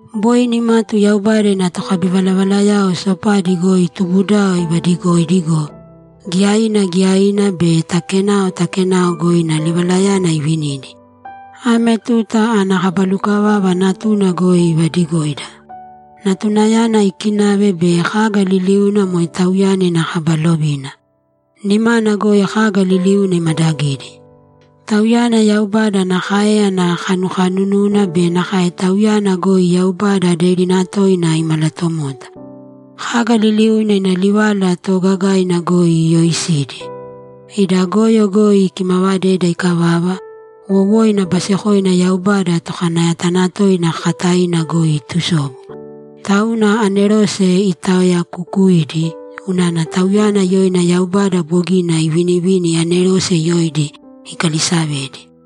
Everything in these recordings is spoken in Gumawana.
Boi nimatu Yaubada ina tokabivalavalayao sopadi goi tubudao ivadigoidi go, giyaina giyaina be ta kenao ta kenao goi ina livalayana ivinidi. Ame tuta ana kaba lukavava Natuna goi ivadigoida. Natunayana ikinave bei kaga liliuna moe Tauyana ina kaba lovina. Nimana goi kaga liliuna imadagidi. Tauyana Yaubada ana káeyana kanukanununa be nakae Tauyana goi Yaubada aderina toina imalatomota. Kaga liliuna ina livala toogagaina goi iyooisidi. Ida goyo goi ikimavadeda ikavava, wowoina basekoina Yaubada Tokanayatanatoina kakataina goi itusobu. Tauna anerose itaoyakukuidi unana Tauyana yoina Yaubada bogina ivinivini anerose yoidi ikalisavedi.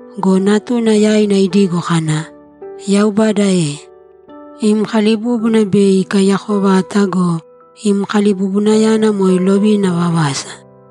Go Natuna yaina idigo kana, ‘Yaubada e, Im kalibúbuna bei ikaiyako vata go, im kalibubunayana moe lovina vavasa.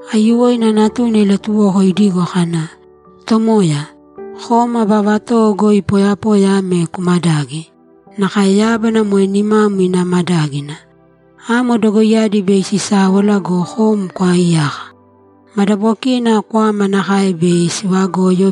Aiyuwoina Natuna ilatuwoko idigo kana, ‘Tomoya, Kom aba vatowo goi poyapoya ame kumadagi; nakae yábana moe nimam ina madágina. Amo dogoiyadi bei sisáwala go, kom kwaaiyaka. Madabokina kwama nakae bei sivagoyo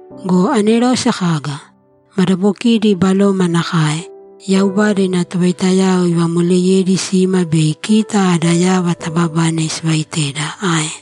Go anerose kaga? Madabokidi baloma nakae, Yaubada ina tovaitayao ivamoleyedi sima bei kita ada yava taababane sivaiteda ae?